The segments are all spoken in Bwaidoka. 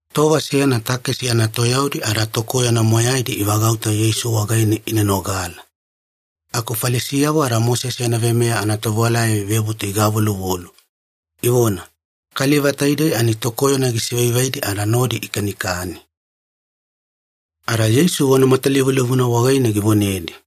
Tova seyana takesi anatoyaudi ada tokoyona moyaidi ivagauta Yeisu wagaine ina nogala. Aku Falisiyavo ada Mosese yana veimeya anatovewalayavo ivebutu igavoluvolu, ivona, “Kaliva taidei ani tokoyona gisivaivaidi ada nodi ikanikani.” Ada Yeisu vona matalivulivuna wagaine givonedi,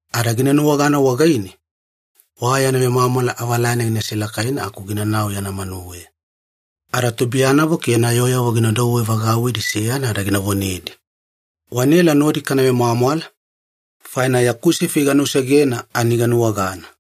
Ada gina nuwagana wagaine, wa yana vemwamwala avalane gina selakaina aku ginanau yana manuweya. Ada tubuiyanavo ke yana yooyavo gina douwe vagauwidi seyana ada gina vonedi, ‘Wanaela nodi kana vemwamwala, faina yaku sifi ganusegena ani ganuwagana.’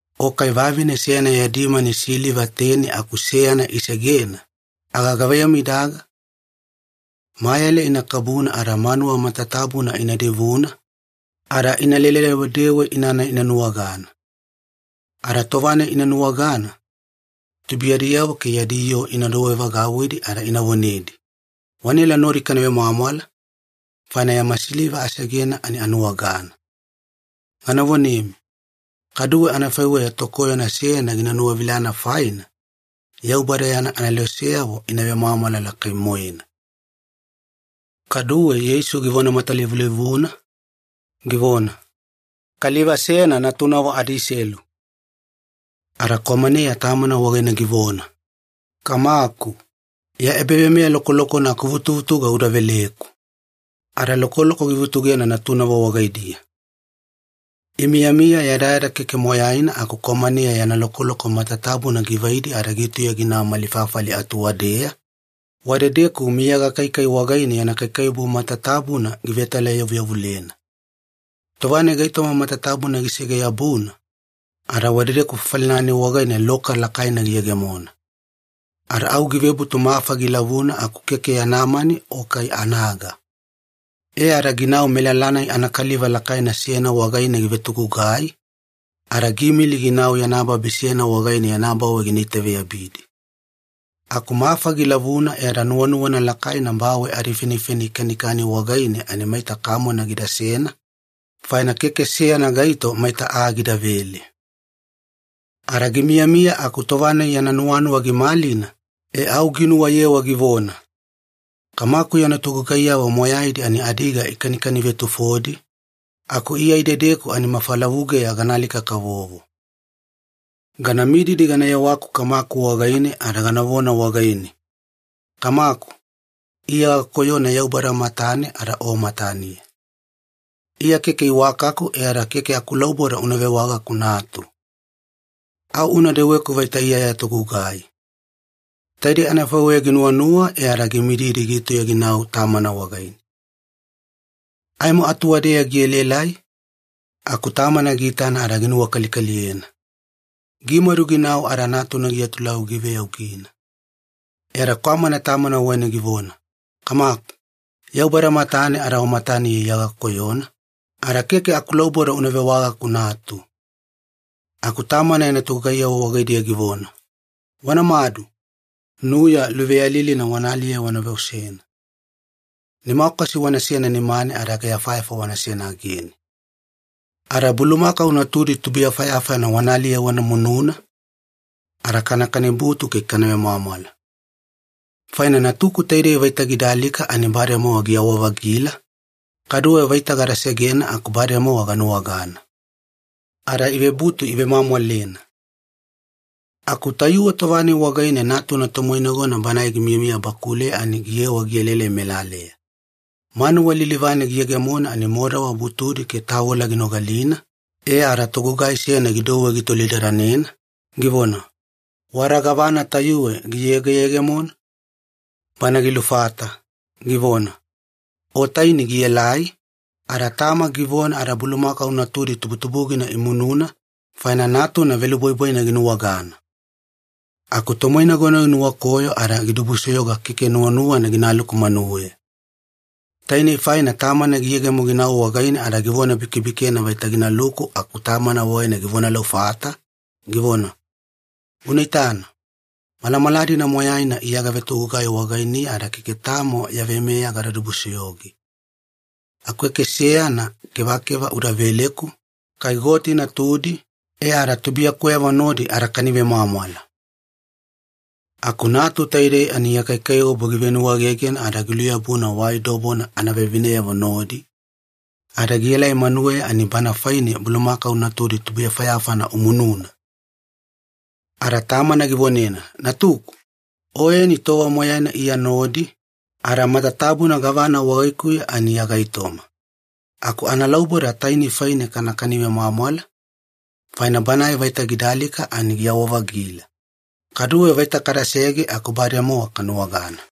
“O kai vavine seyana yadi mani siliva teni aku seyana isegena, aga gavaiyamu idaga? Mayale ina kabuna ada manuwa matatabuna ina divuna, ada inalele-dewedewe inana ina nuwagana. Ada tova-nai ina nuwagana, tubuiyadiyavo ke yadi yooyavo ina douwevagauwidi ada ina vonedi, ‘Wanaela nodi kana vemwamwala, faina yama siliva asegena ani anuwagana.’ Gana vonemi, kaduwe anafaiweya tokoyona seyana gina nuwavilana faina, Yaubada yana aneloseyavo ina vemwamwala lakai-moena.” Kaduwe Yeisu givona matalivulivuna, givona, “Kaliva seyana natunavo adiselu. Ada kwamaneya tamana wagaine givona, ‘Kamaku, ya ebaveimeya lokolokona akuvutuvutuga uda veleku.’ Ada lokoloko givutugena natunavo wagaidiya. “Imiyamiya yadayada keke moyaina aku kwamaneya yana lokoloko matatabuna givaidi ada gitauya ginau mali fafali atuwadeya, wadedeku miya gakaikai wagaine yana kaikaiwabu matatabuna givetalayavuyavulena. Tova-nai gaitoma matatabuna gisege-yabuna, ada wadedeku fafali-nai wagaine loka lakaina giyegemona. Ada au givebutu mafa gilavuna aku keke yana mani o kai anaga. E ada ginau melala-nai anakaliva lakaina seyana wagaine givetogugai, ada giimili ginau yana babi seyana wagaine yana bawe gina itaveyabidi. Aku mafa gilavuna e ada nuwanuwana lakaina bawe adifenifeni ikanikani wagaine ani maita kamone gidasena, faina keke seyana gaito maita aa gidavele. “Ada gimiyamiya aku tova-nai yana nuwanuwa gimalina, e au ginuwayewa givona, ‘Kamaku yana togugaiyavo moyaidi ani adiga ikanikani-vetufodi, aku Iya idedeku ani mafalavugeya gana alika-kavovo. Gana mididi gana yewaku kamaku wagaine ada ganavona wagaine, “Kamaku, Iya gakoyona Yaubada matane ada o mataniya. Iya keke iwakaku e ada keke akulauboda una vewagaku natu. Au una deweku vaita Iya ya togugai.”; Taidei anafaiweya ginuwanuwa e ada gimididi gitauya ginau tamana wagaine. “Aimo atuwada-deya gielaelai aku tamana giitana ada ginuwakalikaliyena. Gimadu ginau ada natuna giatulauwi giveyaugina. E ada kwamana tamana wagaine givona, ‘Kamaku, Yaubada matane ada o mataniya Iya gakoyona, ada keke akulauboda una vewagaku natu.’ “Aku tamana yana togugaiyavo wagaidiya givona, ‘Wanamadu, nuya luveyalilina wana aliye wana veosena. Nimakwasi wanasena nimane ada ageyafayafa wanasena agene. Ada bulumakau natudi tubuyafayafana wana aliye wana mununa, ada kana kanibutu ke kana vemwamwala. Faina natuku taidei vaita gida alika ani bademowa giyawa-vagila, kaduwe vaita gada segena aku bademowa ganuwagana.’ Ada ivebutu ivemwamwalena. “Aku tayuwe tova-nai wagaine natuna tomoinagona banae gimiyamiya bakuleya ani giyewa gielaelai melaleya. Manuwa lilivane giyegemona ani modawa butudi ke tavola ginogalina e ada togugai seyana gidouwe gitolidadanena, givona, ‘Wada gavana tayuwe giyegeyegemona?’ “Banae gilufata, givona, ‘O taini gielai, ada tama givona ada bulumakau natudi tubutubugina imununa, faina natuna velubwaibwaina ginuwagana.’ “Aku tomoinagona ginuwakoyo ada gidibusoyoga keke nuwanuwana ginaluku manuweya. Tainei faina tamana giyegemo ginau wagaine ada givona-bikebikena vaita ginaluku aku tamana wagaine givonalufata, givona, ‘Una itana, malamala-dina moyaina Iya gavetogugai wagainiya ada keke tamo ya veimeya gada dibusoyoge. Aku keke seyana kevakeva uda veleku, kai goti natudi, e ada tubuiyakuweyavo nodi adakani vemwamwala. Aku natu taidei ani ya kaikaiwabu givenuwegegena ada giluyabuna wai dobona anavevineyavo nodi, ada gielai manuweya ani bana faine bulumakau natudi tubuyafayafana umununa!’ “Ada tamana givonena, ‘Natuku, oyeni tova moyaina Iya nodi, ada matatabuna gavana wagaikuya ani ya gaitoma. Aku analauboda taini faine kanakani vemwamwala, faina banae vaita gida alika ani giyawa-vagila. Kaduwe vaita kadasege aku bademowa kanuwagana.’”